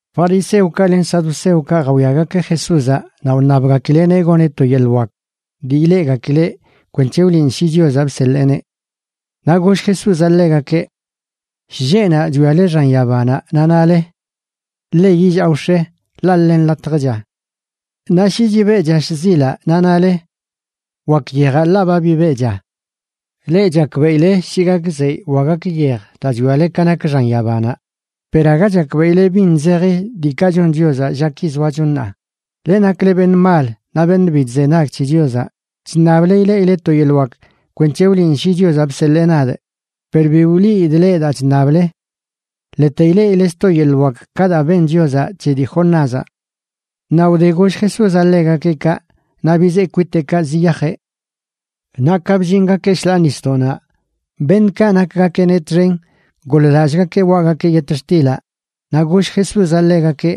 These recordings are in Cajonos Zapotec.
Fariseokaꞌ len saduceokaꞌ jawiagakeꞌ Jesúzaꞌ naꞌ wṉabgakileꞌneꞌ goneꞌ to yeḻꞌ wak dii ileꞌgakileꞌ kwenc̱he wliꞌn shi Chiozanꞌ bseḻeeneꞌ. Naꞌ goll Jesúzaꞌ ḻegakeꞌ: ―Shlleꞌnaꞌ chwiale xan yabanaꞌ naꞌ nale: “Ḻe yillaa wx̱e, ḻaꞌ ḻe nḻatjcha.” Naꞌ shi chibeꞌcha shzilaꞌ naꞌ nale: “Wak yejaꞌ ḻaꞌ ba bibeꞌcha.” Leꞌ chakbeꞌile shi gak zeyꞌ wa gak yej daa chwiale ka nak xan yabanaꞌ, per aga chakbeꞌile bin zeji diikaꞌ chon Chiozaꞌ llaki zoacho ṉaa. Leꞌ nakle beṉꞌ mal naꞌ beṉꞌ bi chzenag c̱he Chiozaꞌ, chṉable ileꞌileꞌ to yeḻꞌ wak kwenc̱he wliꞌn shi Chiozaꞌ bseḻee nadꞌ, per bi wliidꞌ leꞌ daa chṉable. Ḻete ileꞌile sto yeḻꞌ wak ka daa ben Chiozaꞌ c̱he dii Jonázaꞌ. Naꞌ wde goll Jesúzaꞌ ḻegakeꞌ kaꞌ, naꞌ bizee kwiteꞌkaꞌ ziyajeꞌ. Naꞌ ka bllingakeꞌ shḻaa nisdoꞌnaꞌ, beṉꞌkaꞌ nakgakeꞌneꞌ txen goḻ-lallꞌgakeꞌ waꞌgakeꞌ yetxtilaꞌ. Naꞌ goll Jesúzaꞌ ḻegakeꞌ: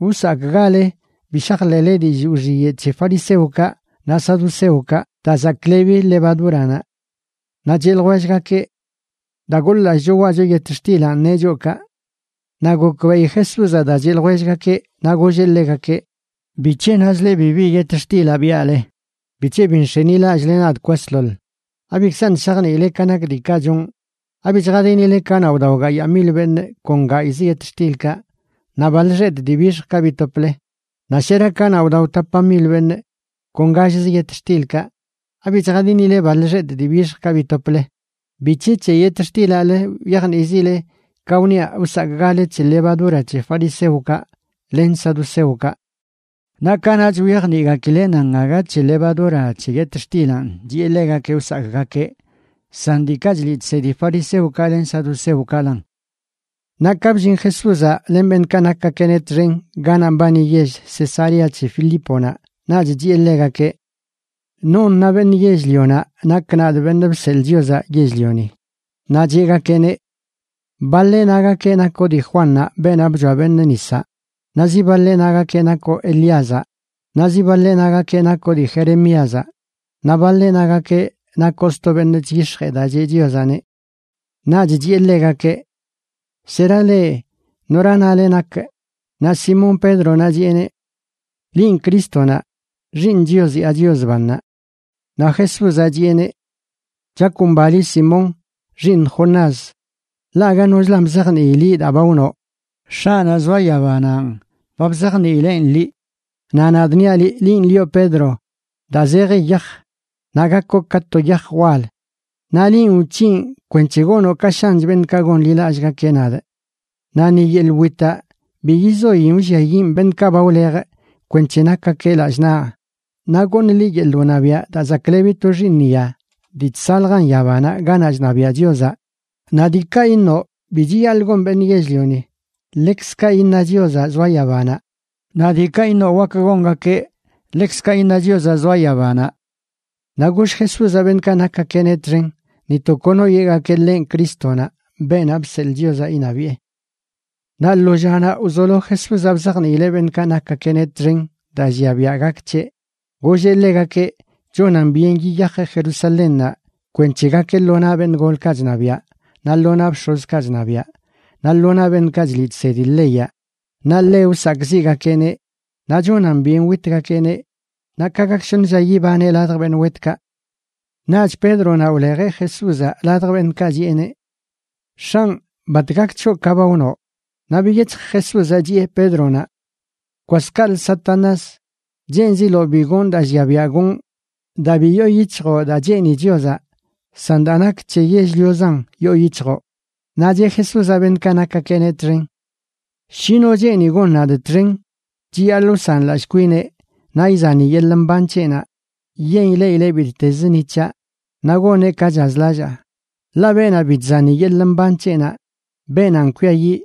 ―Wsakꞌgale bi shajḻeꞌle dillꞌ wxiyeꞌ c̱he fariseokaꞌ naꞌ saduceokaꞌ, daa zaklebi levadúranaꞌ. Naꞌ cheꞌ ljwellgakeꞌ: ―Daa goḻ-lallꞌcho waꞌcho yetxtilanꞌ neꞌ choꞌ kaꞌ. Naꞌ gokbeꞌi Jesúzaꞌ daa cheꞌ ljwellgakeꞌ naꞌ golleꞌ ḻegakeꞌ: ―¿Bic̱he nazle bibi yetxtilaꞌ biaꞌle? ¿Bic̱he bi nx̱enilallꞌle nadꞌ kwasḻoḻ? ¿Abikzaṉꞌ shajniile ka nak diikaꞌ chonꞌ? ¿Abi chjadinile kanaꞌ wdao gayaa mil beṉꞌ kon gayꞌzə yetxtilkaꞌ naꞌ baḻ xetꞌ dii bixjkaꞌ bitople? Naꞌ ¿shera kanaꞌ wdao tapa mil beṉꞌ kon gallzə yetxtilkaꞌ? ¿Abi chjadinile baḻ xetꞌ dii bixjkaꞌ bitople? ¿Bic̱he c̱he yetxtilaꞌlə wyajnizile ka wniaꞌ wsakꞌgale c̱he levadura c̱he fariseokaꞌ len saduceokaꞌ? Naꞌ kanaꞌch wyajniꞌgakileꞌ nan aga c̱he levadura c̱he yetxtilanꞌ chiꞌe ḻegakeꞌ wsakꞌgakeꞌ san diikaꞌ chliꞌ chsedi fariseokaꞌ len saduceokaꞌlan. Naꞌ ka bllin Jesúzaꞌ len beṉꞌkaꞌ nakgakeꞌneꞌ txen ganaꞌ mbani yell Cesarea c̱he Filíponaꞌ, naꞌch chiꞌe ḻegakeꞌ: ―¿Non na beṉꞌ yell-lionaꞌ nakꞌ, nadꞌ, Beṉꞌ Bseḻꞌ Chiozaꞌ Yell-lioni? Naꞌ cheꞌgakeꞌneꞌ: ―Baḻeꞌ nagakeꞌ nakoꞌ dii Juannaꞌ, beenaꞌ bchoa beṉꞌ nisaꞌ, naꞌ zi baḻeꞌ nagakeꞌ nakoꞌ Elíazaꞌ, naꞌ zi baḻeꞌ nagakeꞌ nakoꞌ dii Jeremíazaꞌ, naꞌ baḻeꞌ nagakeꞌ nakoꞌ sto beṉꞌ chyix̱jee daa cheꞌ Chiozaꞌneꞌ. Naꞌch chiꞌe ḻegakeꞌ: ―¿Shera leꞌ? ¿Nora nale nakꞌ? Naꞌ Simón Pédronaꞌ chiꞌeneꞌ: ―Linꞌ Crístonaꞌ, Xiiṉ Chios yaa Chios bannaꞌ. Naꞌ Jesúzaꞌ chiꞌeneꞌ: ―Chakomba liꞌ Simón, xiiṉ Jonás, ḻaꞌ aga nochlan bzajnii liꞌ daa ba wnoꞌ. X̱aꞌnaꞌ zoa yabananꞌ ba bzajniileꞌn liꞌ. Naꞌ nadꞌ niaꞌ liꞌ, linꞌ lioꞌ Pedro, daa zeji yaj, naꞌ gakoꞌ ka to yaj wal naꞌ linꞌ wc̱hinꞌ kwenc̱he gonoꞌ ka shanch beṉꞌkaꞌ gonḻilallꞌgakeꞌ nadꞌ, naꞌ ni yeḻꞌ witaꞌ bi yizoin wlliayiꞌn beṉꞌkaꞌ ba wlejꞌ kwenc̱he nakgakeꞌ lallꞌ naꞌ. Naꞌ goṉꞌ liꞌ yeḻꞌ wṉabiaꞌ daa zaklebi to xiiṉya dii chsaljan yabanaꞌ ganaꞌ chṉabiaꞌ Chiozaꞌ. Naꞌ diikaꞌ iṉoꞌ bi chiyaḻꞌ gon beṉꞌ yell-lioni, ḻekzkaꞌ iṉa Chiozaꞌ zoa yabanaꞌ, naꞌ diikaꞌ iṉoꞌ wak gongakeꞌ, ḻekzkaꞌ iṉa Chiozaꞌ zoa yabanaꞌ. Naꞌ goll Jesúzaꞌ beṉꞌkaꞌ nakgakeꞌneꞌ txen ni to kono yeꞌgakeꞌ ḻenꞌ Crístonaꞌ, beenaꞌ bseḻꞌ Chiozaꞌ iṉabiꞌe. Naꞌ lo llanaꞌ wzolo Jesúzaꞌ bzajniileꞌ beṉꞌkaꞌ nakgakeꞌneꞌ txen daa llia biaꞌ gak c̱heꞌ. Golleꞌ ḻegakeꞌ chonan byen yiyajeꞌ Jerusalénnaꞌ kwenc̱he gakeꞌ lo naꞌ beṉꞌ golkaꞌ chṉabiaꞌ naꞌ lo naꞌ bx̱ozkaꞌ chṉabiaꞌ naꞌ lo naꞌ beṉꞌkaꞌ chliꞌ chsedi leyaꞌ, naꞌ ḻe wsakꞌziꞌgakeꞌneꞌ, naꞌ chonan byen witgakeꞌneꞌ naꞌ ka gak shoṉ lla yibaneꞌ ladj beṉꞌ wetkaꞌ. Naꞌch Pédronaꞌ wlejeꞌ Jesúzaꞌ ladj beṉꞌkaꞌ chiꞌeneꞌ: ―X̱anꞌ, ¡bat gak c̱hoꞌ ka ba wnoꞌ! Naꞌ biyec̱hj Jesúzaꞌ chiꞌe Pédronaꞌ: ―Kwas kaꞌlə, Satanás. Cheenziloꞌ bi gonꞌ daa llia biaꞌ gonꞌ daa bi yoo yic̱hjoꞌ daa cheeni Chiozaꞌ, san daa nak c̱he yell-liozan yoo yic̱hjoꞌ. Naꞌ cheꞌ Jesúzaꞌ beṉꞌkaꞌ nakgakeꞌneꞌ txen: ―Shi no cheeni gon nadꞌ txen, chiyaḻꞌ wsanlallꞌ kwineꞌ, naꞌ izani yeḻꞌ mban c̱heꞌnaꞌ yen ileꞌileꞌ bittez ni c̱haꞌ, naꞌ goneꞌ ka chazlallaa. Ḻaꞌ beenaꞌ bi chzani yeḻꞌ mban c̱heꞌnaꞌ, beenanꞌ kwiayiꞌ,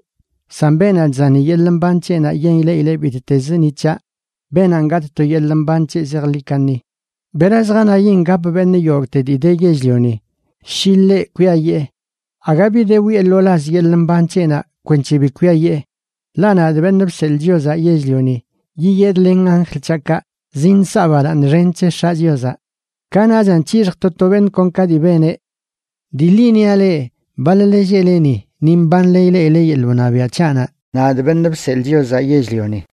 san beenaꞌ chzani yeḻꞌ mban c̱heꞌnaꞌ yen ileꞌileꞌ bittez ni c̱haꞌ, beenanꞌ gatꞌ to yeḻꞌ mban c̱heꞌ zejḻi kaṉi. ¿Bera zjanayin gap beṉꞌ yogꞌte dii de yell-lioni, shi ḻeꞌ kwiayee? Aga bi de wiꞌe lo laz yeḻꞌ mban c̱heꞌnaꞌ kwenc̱he bi kwiayee. Ḻaꞌ nadꞌ, Beṉꞌ Bseḻꞌ Chiozaꞌ Yell-lioni, yiyedꞌ len anjl c̱haꞌkaꞌ zinsaꞌ balaaṉ xen c̱he X̱aꞌ Chiozaꞌ. Kanaꞌchan c̱hixjꞌ to to beṉꞌ kon ka dii beneꞌ. Dii ḻi niaꞌ leꞌ, baḻ-le lleꞌle ni, ni mbanle ileꞌile yeḻꞌ wṉabiaꞌ c̱haꞌnaꞌ, nadꞌ, Beṉꞌ Bseḻꞌ Chiozaꞌ Yell-lioni.